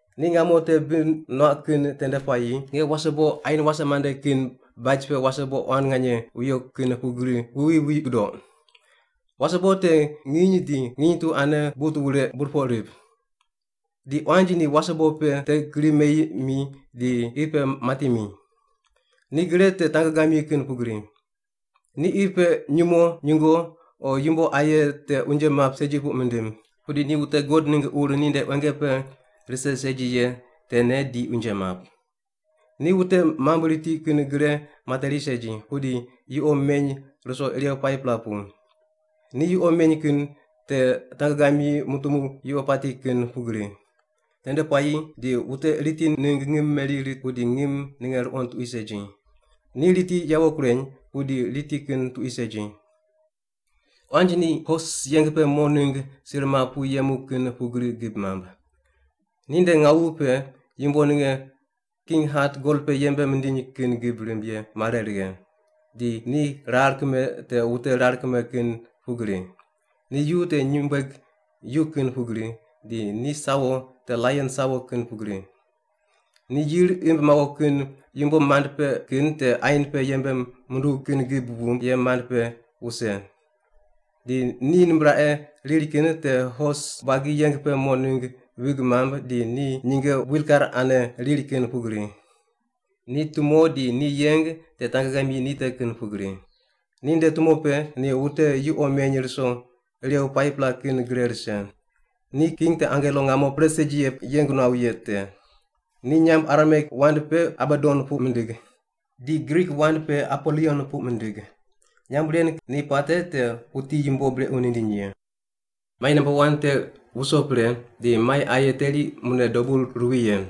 Ni ngamo te bi nuaq kin tende puayi nge wasebo ain wase mande kin baj pe wasebo quan nganye wuyo kin pugri wuwi wi gudoq. Wasebo te nginy di nginy tu ane but wure burpoq rip. Di quanj ni wasebo pe te gri meyi mi di qi pe mati mi. Ni gre te tangegamyi kin pugri. Ni qi pe nyumo, nyungo o yumbo aye te unje map segi puq mindim. Pudi ni wute God ningg ur ninde quenge pe rise segi ye tene di unje map. Ni wute mamb riti kin gre materi segi, pudi yuqo meny ruso irew 5-pela pu. Ni yuqo meny kin te tangegamyi mutumu yuqo pati kin pugri. Tende puayi di wute riti ningg ngim meri rit, pudi ngim ninge ruqond tuqui segi. Ni riti yawo kureny, pudi riti kin tuqui segi. Quanj ni hos yeng pe mo ningg sir map pu yemu kin pugri gib mamb. Ninde ngawu pe yumbo ninge king hat gol pe yembe mindiny kin gib rimb ye mare righe, di ni rar kime te wute rar kime kin pugri. Ni yu te nyumbueg yu kin pugri, di ni sawo te laion sawo kin pugri. Ni yir imb mawo kin yumbo mand pe kin te ain pe yembe munduw kin gib wumb ye mand pe wuse. Di ni nimbraqe riri kin te hos buagi yeng pe mo ningg vig mamb di ni nyinge wilkar ane riri kin pugri. Ni tumo di ni yeng te tangegamyi ni te kin pugri. Di ninde tumo pe ni wute yuqo meny ruso irew 5-pela kin gre rise. Ni king te angelo ngamo pre segi ye yeng nuaw ye te. Ni nyamb Arameik wand pe Abadon puq mindig. Di Grik wand pe Apolion puq mindig. (Nyamb ren ni puate te “wuti yumbo brequ nindiny ye.”) Mai namba wan te wuso pre, di mai aye teri mune dobu ruwi ye.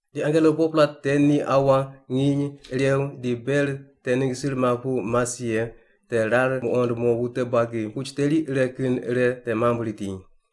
Di angelo 4-pela te ni aua, nginy, irew di ber te ningg sir map pu mas ye te rar muqond mo wute buagi puch teri ire kin ire te mamb riti.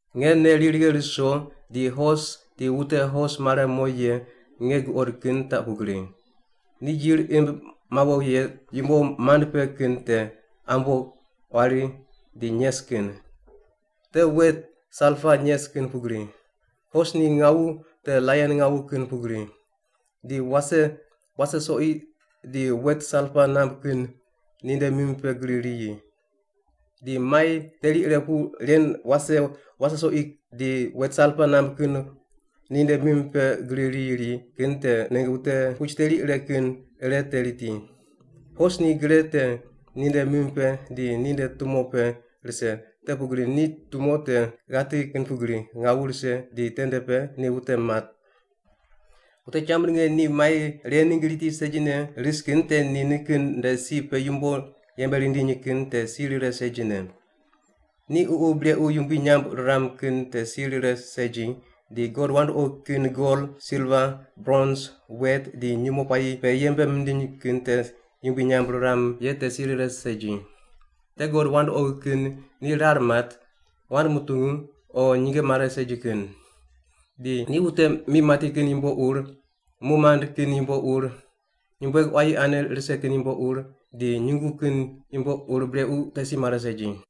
Nge nei ri righe ruso di hos di wute hos mare mo ye nge guqod kin taq pugri: Ni yir imb mawo ye yumbo mand pe kin te ambo, quari di nyes kin. Te wet salpa nyes kin pugri. Hos ni ngawu te laion ngawu kin pugri. Di wase, wase soqi di wet salpa namb kin ninde mim pe gri riyi. Di mai teri ire pu ren wase, wase soqi di wet salpa namb kin ninde mim pe gri riyi ri kin te ningg wute puch teri ire kin ire te riti. Hos ni gre te ninde mim pe di ninde tumo pe rise, te pugri ni tumo te ghati kin pugri, ngawu rise di tende pe ni wute mat. Wute cham ninge ni mai ren ningg riti segi risne kin te ni nikin nde si pe yumbo yembe rindiny kin te si rire segine. Ni ququ brequ yumbui nyamb riram kin te si rire segi, di god wandoqi kin gol, silva, brons, wet di nyumo puayi pe yembe mindiny kin te yumbui nyamb riram ye te si rire segi. Te god wandoqi kin ni rar mat, wand mutungu o nyinge mare segi kin. Di ni wute mi mati kin yumbo ur, mu mand kin yumbo ur, nyumbueg quayi ane rise kin yumbo ur, di nyungu kin yumbo ur brequ te si mare segi.